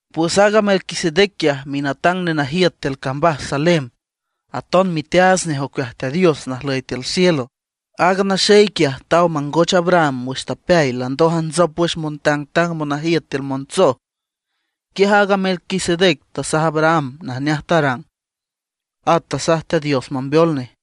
Pues aaga Melquisedec quiaj minatang nenajiüt tiül cambaj Salem, aton miteaats nej ocueaj Teat Dios najlüy tiül cielo. Aaga naxey quiaj taw mangoch Abraham wüx tapeay landoj ajntsop wüx montangtang monajiüt tiül montsoj. Quiaj aaga Melquisedec tasaj Abraham najneaj tarang, at tasaj Teat Dios mambeol nej.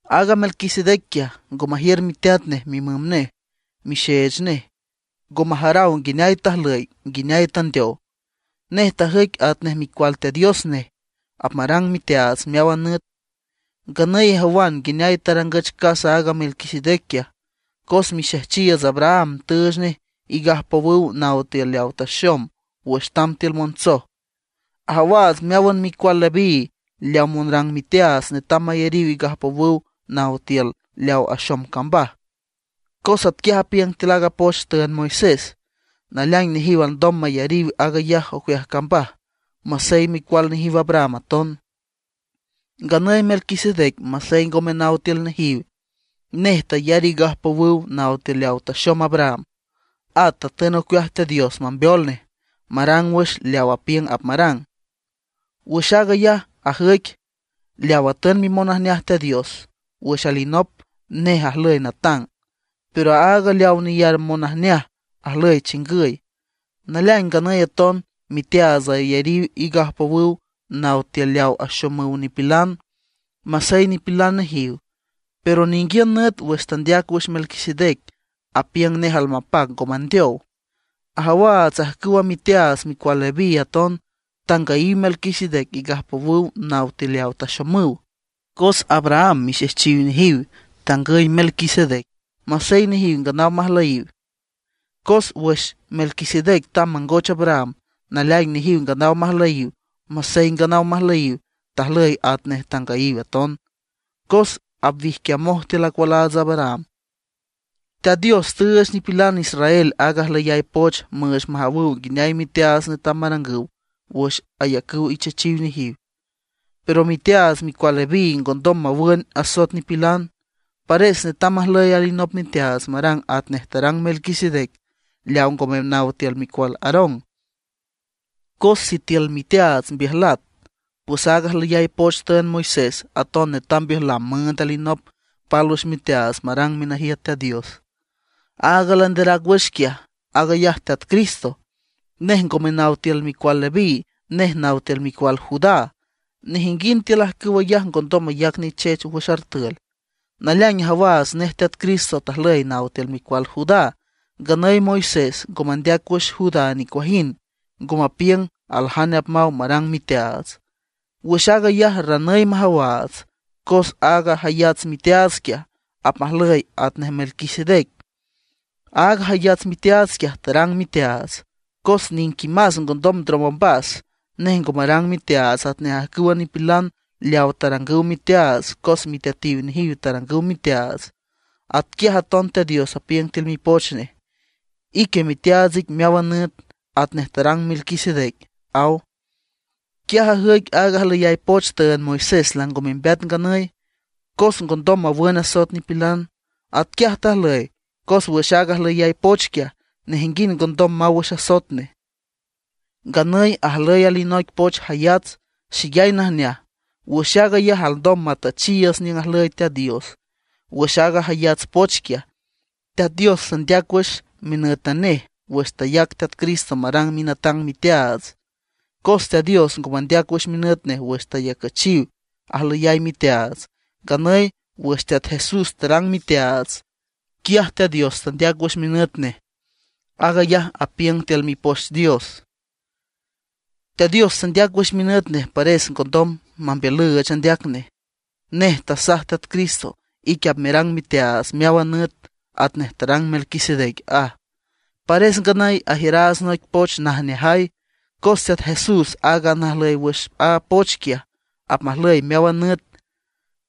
Aaga Melquisedec quiaj ngo majiür miteat nej, mimüm nej, mixeech nej; ngo majaraw nguineay tajlüy, nguineay tandeow. Nej tajüic atnej Micual Teat Dios nej, apmarang miteaats meáwan nüt. Nganüy ijawan nguineay tarangüch casa aaga Melquisedec quiaj, cos mixejchiiüts Abraham tüüch nej igajpowüw naw tiül leaw taxom wüx tamb tiül montsoj. Ajawaats meáwan micual Leví leaw monrang miteaats netam mayariw igajpowüw naw tiül leaw axom cambaj, cos atquiaj apiüng tiül aaga poch tüünd Moisés. Naleaing nejiw alndom mayariw aag ayaj ocueaj cambaj, masey micual nejiw Abraham aton. Nganüy Melquisedec masey ngome naw tiül nejiw, nej tayar igajpowüw naw tiül leaw taxom Abraham, at tatün ocueaj Teat Dios mambeol nej, marang wüx leaw apiüng apmarang. Wüx aag ayaj ajüic leaw atün mimonajneaj Teat Dios wüx alinop, nej ajlüy natang; pero aaga leaw neyar monajneaj ajlüy chingüy. Naleaing nganüy aton miteaats ayariw igajpowüw naw tiül leaw axomüw nipilan, masey nipilan nejiw. Pero ninguiün nüt wüx tandeac wüx Melquisedec, apiüng nej almapac ngo mandeow. Ajawaats ajcüwa miteaats micual Leví aton tangüyiw Melquisedec igajpowüw naw tiül leaw taxomüw, cos Abraham mixejchiw nejiw tangüy Melquisedec, masey nejiw nganaw majlüyiw. Cos wüx Melquisedec tamb mangoch Abraham, naleaing nejiw nganaw majlüyiw. Masey nganaw majlüyiw, tajlüy atnej tangüyiw aton, cos apwijquiamoj tiül acualaats Abraham. Teat Dios tüüch nipilan israel aaga ajlüyay poch müüch majawüw nguineay miteaats netam marangüw wüx ayacüw ichechiw nejiw. Pero miteaats micual Leví ngondom mawün asoet nipilan, pares netam majlüy alinop miteaats marang atnej tarang Melquisedec leaw ngome naw tiül micual Aarón. Cos sitiül miteaats mbiüjlat, pues aaga ajlüyay poch tüünd Moisés aton netam mbiüjlam müünd alinop pálwüx miteaats marang minajiüt Teat Dios. Aaga landerac wüx quiaj, aag ayaj Teat Cristo. Nej ngome naw tiül micual Leví, nej naw tiül micual Judá. Nejinguind tiül ajcüw ayaj ngondom mayac nichech wüx artül. Naleaing ajawaats nej Teat Cristo tajlüy naw tiül micual Judá; nganüy Moisés ngo mandeac wüx Judá nicuajind, ngo mapiüng aljane apmaw marang miteaats. Wüx aag ayaj ranüy majawaats, cos aaga jayats miteaats quiaj, apmajlüy atnej Melquisedec. Aaga jayats miteaats quiaj tarang miteaats, cos niquimás ngondom ndrom ombas. Nej ngo marang miteaats atnej ajcüwa nipilan leaw tarangüw miteaats cos miteatiw nejiw tarangüw miteaats. Atquiaj aton Teat Dios apiüng tiül Mipoch Nej: Ique miteaats ic meáwan nüt, atnej tarang Melquisedec, aw. Quiaj ajüic aaga ajlüyay poch tüünd Moisés lango membeat nganüy, cos ngondom mawün asoet nipilan. Atquiaj tajlüy, cos wüx aaga ajlüyay poch quiaj, nejinguind ngondom maw wüx asoet nej. Nganüy ajlüy alinoic poch jayats, xeyay najneaj; wüx aag ayaj alndom matüchiiüts niüng ajlüy Teat Dios. Wüx aaga jayats poch quiaj, Teat Dios tandeac wüx minǘtan nej wüx tayac Teat Cristo marang minatang miteaats. Cos Teat Dios ngo mandeac wüx minüt nej wüx tayacüchiw ajlüyay miteaats; nganüy wüx Teat Jesús tarang miteaats, quiaj Teat Dios tandeac wüx minüt nej. Aag ayaj apiüng tiül Mipoch Dios: Teat Dios tandeac wüx minüt nej, pares ngondom mambiülüüch andeac nej. Nej tasaj Teat Cristo: “Ique apmerang miteaats meáwan nüt, atnej tarang Melquisedec”, aj. Pares nganüy ajiüraats noic poch najneajay, cos Teat Jesús, aaga najlüy wüx a poch quiaj, apmajlüy meáwan nüt.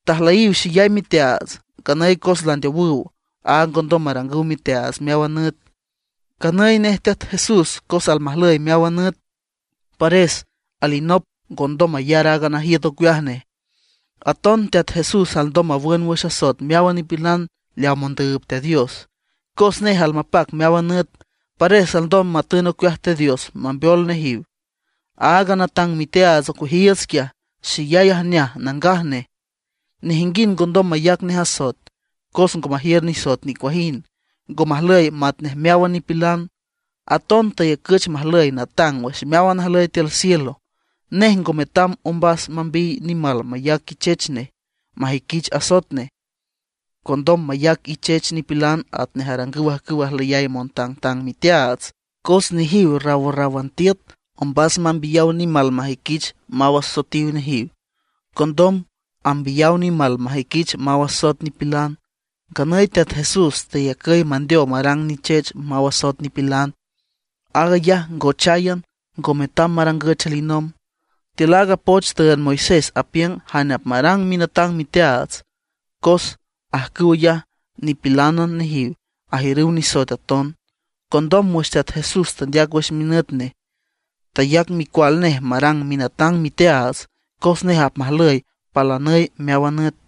Tajlüyiw xeyay miteaats; nganüy cos landeowüw, áag ngondom marangüw miteaats meáwan nüt. Nganüy nej Teat Jesús, cos almajlüy meáwan nüt, pares alinop ngondom mayar aaga najiüt ocueaj nej. Aton Teat Jesús alndom mawün wüx asoet meáwan nipilan leaw mondüüb Teat Dios. Cos nej almapac meáwan nüt, pares alndom matün ocueaj Teat Dios mambeol nejiw. Aaga natang miteaats ocueajiiüts quiaj, xeyay ajneaj, nangaj nej, nejinguind ngondom mayac nej asoet, cos ngo majiür nisoet nicuajind, ngo majlüy matnej meáwan nipilan. Aton tayacüch majlüy natang wüx meáwan najlüy tiül cielo. Nej ngo metam ombas mambiy nimal mayac ichech nej majüiquich asoet nej, condom mayac ichech nipilan atnej arangüw ajcüw ajlüyay montangtang miteaats. Cos nejiw rawrráwan tiüt ombas mambiyaw nimal majüiquich maw asoetiw nejiw; condom ambiyaw nimal majüiquich maw asoet nipilan. Nganüy Teat Jesús teyacüy mandeow marang nichech mawün asoet nipilan. Aag ayaj ngocháyan, ngo metam marangüch alinomb. Tiül aaga poch tüünd Moisés apiüng jane apmarang minatang miteaats; cos ajcüw ayaj nipilánan nejiw, ajiürüw nisoet aton. Condom wüx Teat Dios tandeac wüx minüt nej, tayac Micual nej marang minatang miteaats, cos nej apmajlüy palanüy meáwan nüt.